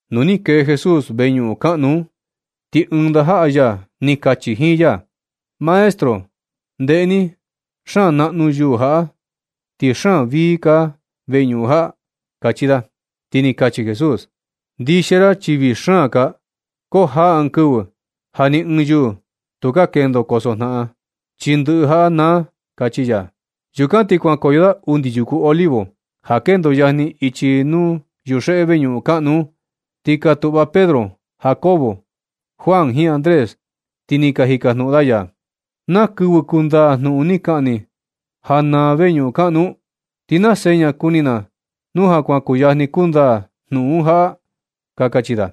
Nu ni kee Jesús veñuꞌun kaꞌnu un, ti ɨɨn ndajaꞌa ya ni kachi jiin ya: ―Maestro, ndeꞌe ni. Xaan naꞌnu yuū jaꞌa, ti xaan vii kaa veñuꞌun jaꞌa―kachi da. Ti ni kachi Jesús: ―Ndixia ra chi vii xaan kaa, ko jaa ɨɨn kɨvɨ ja ni ɨɨn yuu tukaa kendo kosojnaꞌan, chi ndɨꞌɨ jaꞌa naa ―kachi ya. Yukan ti kuankoyo da undi yuku Olivo, ja kendo yajni ichi nuu yuxeꞌe veñuꞌun kaꞌnu un, ti ka tuꞌva Pedro, Jacobo, Juan jiin Andrés, ti ni ka jikajnuꞌun da ya: ―¿Naa kɨvɨ kundaa jnuꞌun ni kaꞌan ni ja naa veñuꞌun kaꞌnu un? ¿Ti naa seña kuni na nu ja kuan kuyajni kundaa jnuꞌun jaꞌa? ―ka kachi da.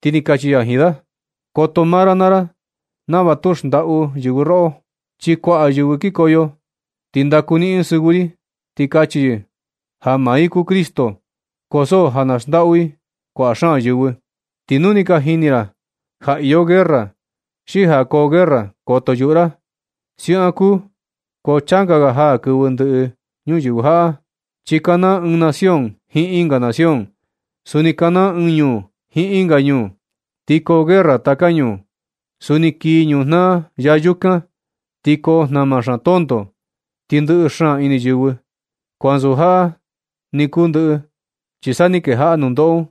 Ti ni kachi ya jiin da: ―Koto maa ra naa ra nava tu xndaꞌu yɨvɨ roꞌo. Chi kuaꞌa yɨvɨ kikoyo, ti ndaku niꞌin yɨ sɨvɨ ri, ti kachi yɨ ja maa i kuu Cristo, ko so ja na xndaꞌu i kuaꞌa xaan yɨvɨ. Ti nu ni ka jini ra ja iyo guerra, xi ja koo guerra, koto yuꞌu ra. Siaꞌan kuu, ko changa ga jaa kɨvɨ ndɨꞌɨ ñuyɨvɨ jaꞌa. Chi kanaa ɨɨn nación jiin ɨnga nación. Suni kanaa ɨɨn ñuu jiin ɨnga ñuu, ti koo guerra taka ñuu. Suni kii ñujnaa ya yukan, ti koo jnama xaan tonto, ti ndɨꞌɨ xaan ini yɨvɨ. Ko ansu jaꞌa ni kuu ndɨꞌɨ, chi sa ni kejaꞌa nundoꞌo un,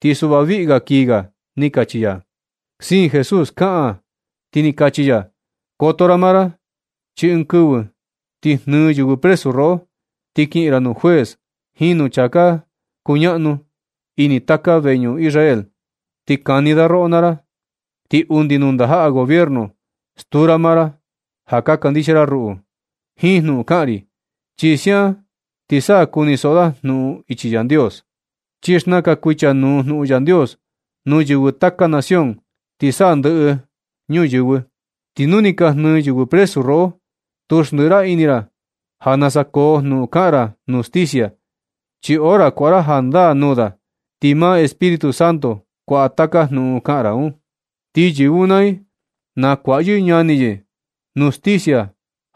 ti suꞌva kii ga ―ni kachi ya. Siin Jesús kaꞌan, ti ni kachi ya: ―Koto ra maa ra chi ɨɨn kɨvɨ ti jnɨɨ yɨvɨ presu roꞌo, ti kiꞌin ra nuu juez jiin nuu chaa ka kuñaꞌnu ini taka veñuꞌun Israel, ti kani da roꞌo naa ra. Ti undi nuu ndajaꞌa gobierno stuu ra maa ra ja ka kandixia ra ruꞌu jiin jnuꞌun kaꞌan ri. Chi siaꞌan ti sa kunisoꞌo da jnuꞌun ichi Yandios. Chi xnakan kuichanuu jnuꞌun Yandios nuu yɨvɨ taka nación ti sa ndɨꞌɨ ñuyɨvɨ. Ti nu ni ka jnɨɨ yɨvɨ presu roꞌo, tu xndɨꞌɨ ra ini ra ja nasa koo jnuꞌun kaꞌan ra nuu justicia. Chi hora kuaꞌa ra jandaa nuu da, ti maa Espíritu Santo kuaꞌa taka jnuꞌun kaꞌan ra un. Ti yɨvɨ un naa i, nakuaꞌa yɨ ñani yɨ nuu sticia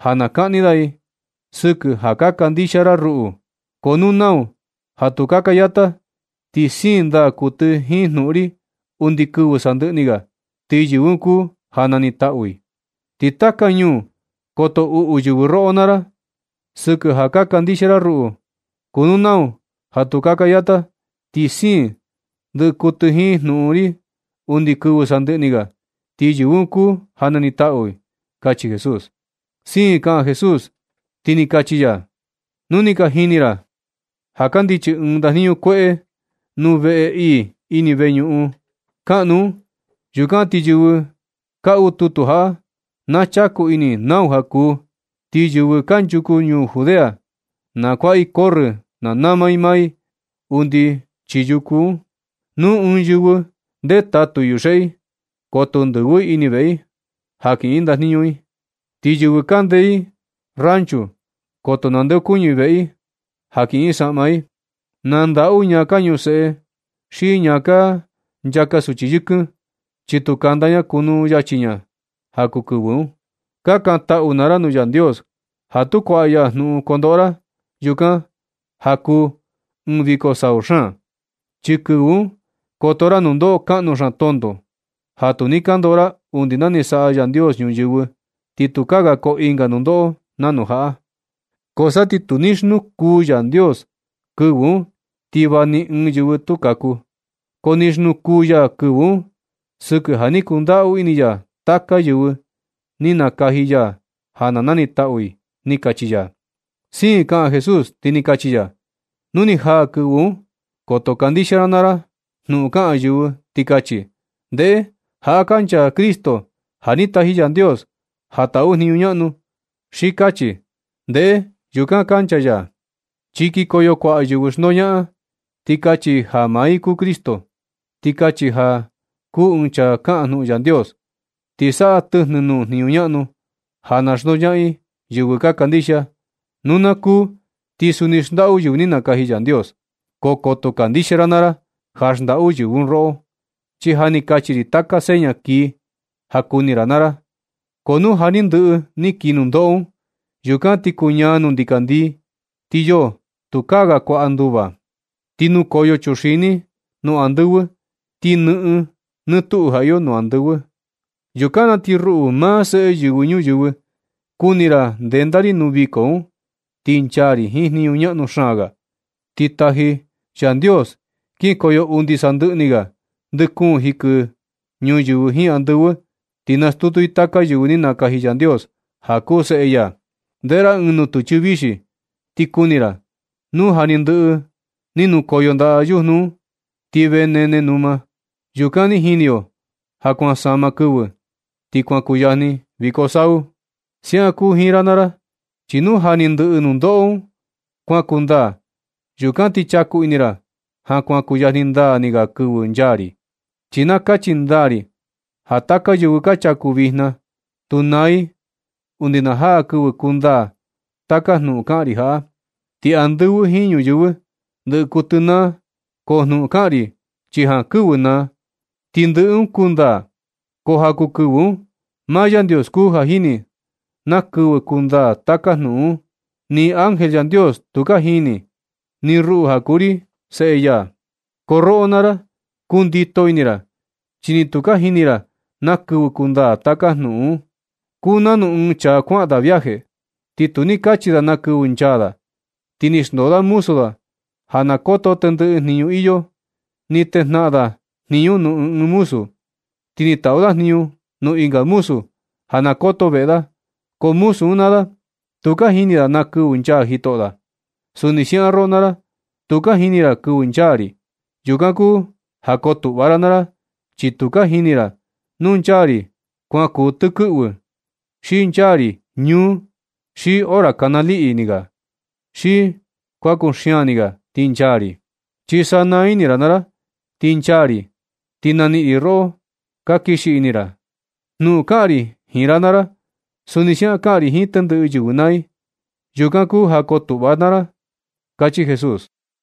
ja na kaꞌni da i sɨkɨ ja ka kandixia ra ruꞌu. Ko nu nau ja tu kaka yata, ti siin ndaa kuɨtɨ jiin jnuꞌun ri undi kɨvɨ sandɨꞌɨ ni ga, ti yɨvɨ un kuu ja nanitaꞌu. Ti taka ñuu koto uꞌu yɨvɨ roꞌo naa ra sɨkɨ ja ka kandixia ra ruꞌu. Ko nu nau ja tu kaka yata ti siin ndɨ kuɨtɨ jiin jnuꞌun ri undi kɨvɨ sandɨꞌɨ ni ga, ti yɨvɨ un kuu ja na nitaꞌu ―kachi Jesús. Siin kaꞌan Jesús, ti ni kachi ya: ―Nu ni ka jini ra ja kandichi ɨɨn ndajniñu kueꞌe nuu veꞌe ii ini veñuꞌun kaꞌnu un, yukan ti yɨvɨ kaꞌu tutu jaꞌa na chaku ini i nau ja kuu. Ti yɨvɨ kanchuku ñuu Judea, na kuaꞌa i corrɨ na nama i maa i undi chii yuku un. Nu ɨɨn yɨvɨ ndetatu i yuxeꞌe i, koto ndɨvɨ i ini veꞌe i ja kiꞌin yɨ ndajniñu i. Ti yɨvɨ kande ɨɨn rancho, koto nandeokuñɨ i veꞌe i ja kiꞌin i saꞌma i. Na ndaꞌu ñaa ka ñuseꞌe xi ñaa ka nchaka suchi yɨkɨn, chi tu kanda ña kunu yachi ña ja kuu kɨvɨ un. Kakantaꞌu naa ra nuu Yandios ja tu kuaꞌa ya jnuꞌun kondoꞌo ra yukan ja kuu ɨɨn viko sau xaan. Chi kɨvɨ un koto ra nundoꞌo kaꞌnu xaan tonto ja tu ni ka ndoꞌo ra undi na ni saꞌa Yandios ñuyɨvɨ. Ti ni tukaa ga koo ɨnga nundoꞌo nanu jaꞌa. Ko sa ti tu ni xnukuu Yandios kɨvɨ un, ti va ni ɨɨn yɨvɨ tu kaku. Ko ni xnukuu ya kɨvɨ un sɨkɨ ja ni kundaꞌu ini ya taka yɨvɨ ni nakaji ya ja na nanitaꞌu i ―ni kachi ya. Siin kaꞌan Jesús, ti ni kachi ya: ―Nu ni jaa kɨvɨ un, koto kandixia ra naa ra jnuꞌun kaꞌan yɨvɨ ti kachi: “Ndeꞌe, jaꞌa kancha Cristo ja ni taji Yandios ja taꞌu jniñu ñaꞌnu”, xi kachi: “Ndeꞌe, yukan kancha ya.” Chi kikoyo kuaꞌa yɨvɨ xndoñaꞌan, ti kachi i ja maa i kuu Cristo, xi kachi ja kuu ɨɨn chaa kaꞌan jnuꞌun Yandios. Ti saꞌa i tɨjnɨ nuu jniñu ñaꞌnu ja na xndoñaꞌan i yɨvɨ ka kandixia. Nu na kuu, ti suni xndaꞌu yɨvɨ ni nakaji Yandios. Ko koto kandixia ra naa ra ja xndaꞌu yɨvɨ un roꞌo, chi ja ni kachi ri taka seña kii ja kuni ra naa ra. Ko nu ja ni ndɨꞌɨ ni kii nundoꞌo un, yukan ti kuñaa nuu ndikandii, ti yoo, tukaa ga kuaꞌa nduva. Ti nukoyo chuxini nuu andɨvɨ, ti nɨꞌɨn nɨ tuꞌu ja iyo nuu andɨvɨ. Yukan na ti ruꞌu, maa Seꞌe Yɨvɨ Ñuyɨvɨ, kuni ra ndenda ri nuu viko un, ti nchaa ri jiin jniñu ñaꞌnu xaan ga. Ti taji ri Yandios kinkoyo undi sandɨꞌɨ ni ga ndɨ kuun jikɨ ñuyɨvɨ jiin andɨvɨ, ti nastutu i taka yɨvɨ ni nakaji Yandios ja kuu seꞌe ya. Ndeꞌe ra ɨɨn nutɨchɨ vixi ti kuni ra. Nu ja ni ndɨꞌɨ ni nakoyo ndaꞌa yujnu un ti vee nene numa, yukan ni jini yo ja kuan sama kɨvɨ ti kuan kuyajni viko sau. Siaꞌan kuu jiin ra naa ra, chi nu ja ni ndɨꞌɨ nundoꞌo un kuan kundaa, yukan ti chaku ini ra ja kuan kuyajni ndaa ni ga kɨvɨ nchaa ri. Chi na kachi ndaa ri ja taka yɨvɨ ka chaku vijna, tu naa i undi na jaa kɨvɨ kundaa taka jnuꞌun kaꞌan ri jaꞌa. Ti andɨvɨ jiin ñuyɨvɨ ndɨꞌɨ kuɨtɨ naa, ko jnuꞌun kaꞌan ri chi jankɨvɨ naa, ti ndɨꞌɨ un kundaa. Ko ja kuu kɨvɨ un, maa Yandios kuu ja jini na kɨvɨ kundaa taka jnuꞌun un. Ni ángel Yandios tu ka jini, ni ruꞌu ja kuu ri seꞌe ya. Ko roꞌo naa ra, kundito ini ra, chi ni tu ka jini ra na kɨvɨ kundaa taka jnuꞌun un. Kuu nanu ɨɨn chaa kuaꞌan viaje, ti tu ni kachi da na kɨvɨ nchaa da. Ti ni xndoo da muzu da ja na koto tendɨꞌɨ jniñu iyo. Ni tejnaꞌan da jniñu nuu ɨɨn ɨɨn muzu un. Ti ni taꞌu da jniñu nuu ɨnga muzu ja na koto veꞌe da. Ko muzu un naa da, tu ka jini da na kɨvɨ nchaa jitoꞌo da. Suni siaꞌan roꞌo naa ra, tu ka jini ra na kɨvɨ nchaa ri. Yukan kuu ja kotuꞌva naa ra, chi tu ka jini ra nu nchaa ri kuan kuu tɨkɨꞌvɨ, xi nchaa ri ñúú, xi hora kana liꞌi ni ga, xi kuan kuxian ni ga ti nchaa ri. Chi sanaa ini ra naa ra ti nchaa ri, ti na niꞌin ri roꞌo ka kixi ini ra. Jnuꞌun kaꞌan ri jiin ra naa ra, suni siaꞌan kaꞌan ri jiin tendɨꞌɨ yɨvɨ naa i. Yukan kuu ja kotuꞌva naa ra ―kachi Jesús.